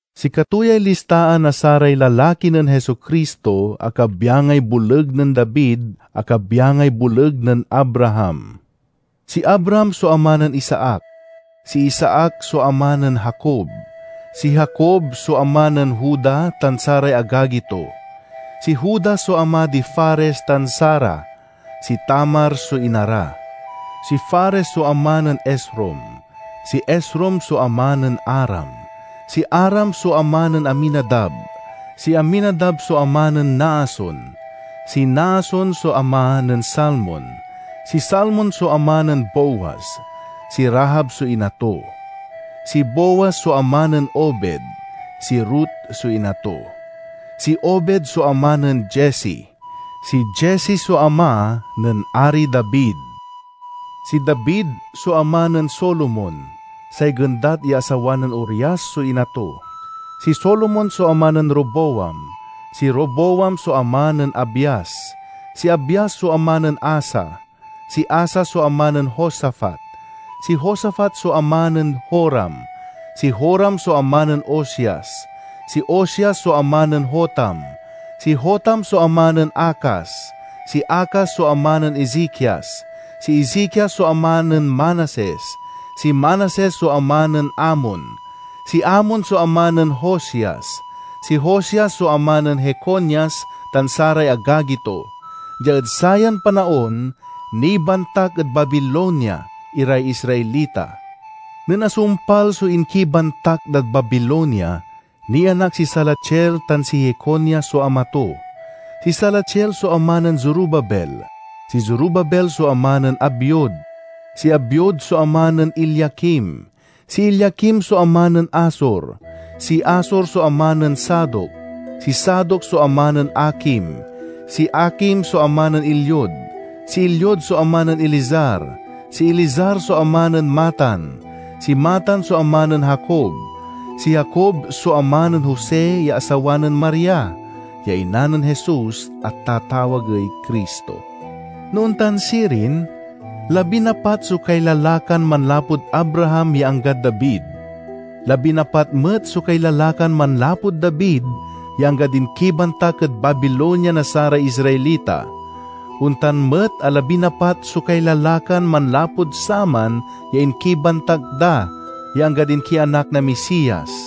Sikato yay listaan na saray lalaki nen Jesu-Cristo a kabyangay boleg nen David a kabyangay boleg nen Abraham. Si Abraham so ama nen Isaac; si Isaac so ama nen Jacob; si Jacob so ama nen Juda tan saray agagi to. Si Juda so ama di Fares tan Zara (si Tamar so ina ra); si Fares so ama nen Esrom; si Esrom so ama nen Aram. Si Aram so ama nen Aminadab; si Aminadab so ama nen Naason; si Naason so ama nen Salmon. Si Salmon so ama nen Booz (si Rahab so ina to); si Booz so ama nen Obed (si Ruth so ina to); si Obed so ama nen Jesse. Si Jesse so ama nen Ari David. Si David so ama nen Solomon (say gendat ya asawa nen Urias so ina to). Si Solomon so ama nen Roboam; si Roboam so ama nen Abias; si Abias so ama nen Asa. Si Asa so ama nen Josafat; si Josafat so ama nen Joram; si Joram so ama nen Ozias. Si Ozias so ama nen Jotam; si Jotam so ama nen Acaz; si Acaz so ama nen Ezekias. Si Ezekias so ama nen Manases; si Manases so ama nen Amon; si Amon so ama nen Josias. Si Josias so ama nen Jeconias tan saray agagi to. Dia ed sayan panaon nibantak ed Babilonia iray Israelita. Nen asumpal so inkibantak dad Babilonia, nianak si Salatiel tan si Jeconias so ama to. Si Salatiel so ama nen Zorobabel; si Zorobabel so ama nen Abiud; si Abiud so ama nen Eliakim; si Eliakim so ama nen Azor. Si Azor so ama nen Sadoc; si Sadoc so ama nen Akim; si Akim so ama nen Eliud. Si Eliud so ama nen Eleazar; si Eleazar so ama nen Matan; si Matan so ama nen Jacob. Si Jacob so ama nen Jose ya asawa nen Maria, ya ina nen Jesus a tatawagey Cristo. No ontan sirin, labinapat so kailalakan manlapud Abraham ya anggad David; labinapat met so kailalakan manlapud David ya anggad inkibantak ed Babilonia na saray Israelita; ontan met a labinapat so kailalakan manlapud saman ya inkibantak da ya anggad inkianak na Misias.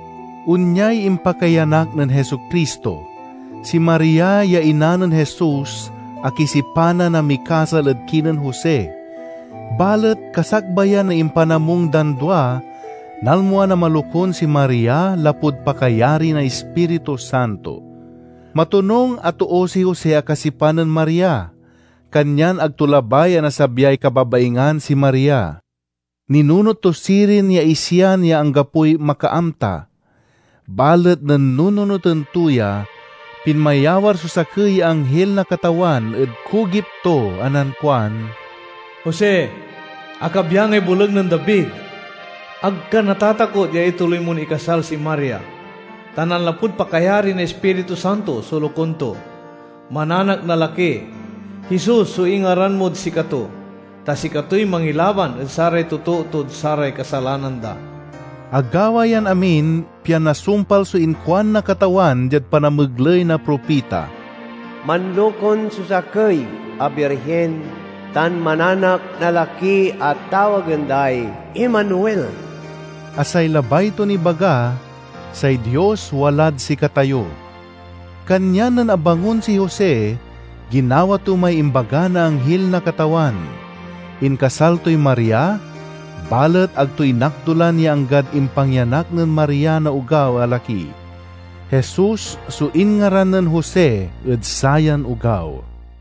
Onyay impakaiyanak nen Jesu-Cristo: Si Maria ya ina nen Jesus akisipanan a mikasal ed kinen Jose. Balet kasakbayan na impanamung dan dua, nalmuan a malokun si Maria lapud pakayari na Ispiritu Santo. Matonung a too si Jose a kasipan nen Maria, kanyan ag to labay a nasabyay kababaingan si Maria. Ninunot to sirin ya isian ya anggapoy makaamta. Balet nen nununoten to ya, pinmayawar so sakey ya anghil na Katawan ed kugip to a nankuan: "Jose, a kabyangay boleg nen David, ag ka natatakot ya ituloy mon ikasal si Maria, ta nanlapud pakayari na Ispiritu Santo so lokun to. Mananak na laki. Jesus so ingaran mod sikato, ta sikatoy mangilaban ed saray totoo tod saray kasalanan da." Agawa yan amin, pian nasumpal so inkuan na Katawan diad panamegley na propita, "Manlokun so sakey a birhin, tan mananak na laki a tawagen day Emmanuel" (a say labay ton ibaga: "Say Dios walad sikatayo"). Kanyan nen abangon si Jose, ginawa to may imbaga na anghil na Katawan. Inkasal toy Maria, balet ag to inakdulan ya anggad impangyanak nen Maria na ogaw a laki. Jesus so inngaran nen Jose ed sayan ogaw.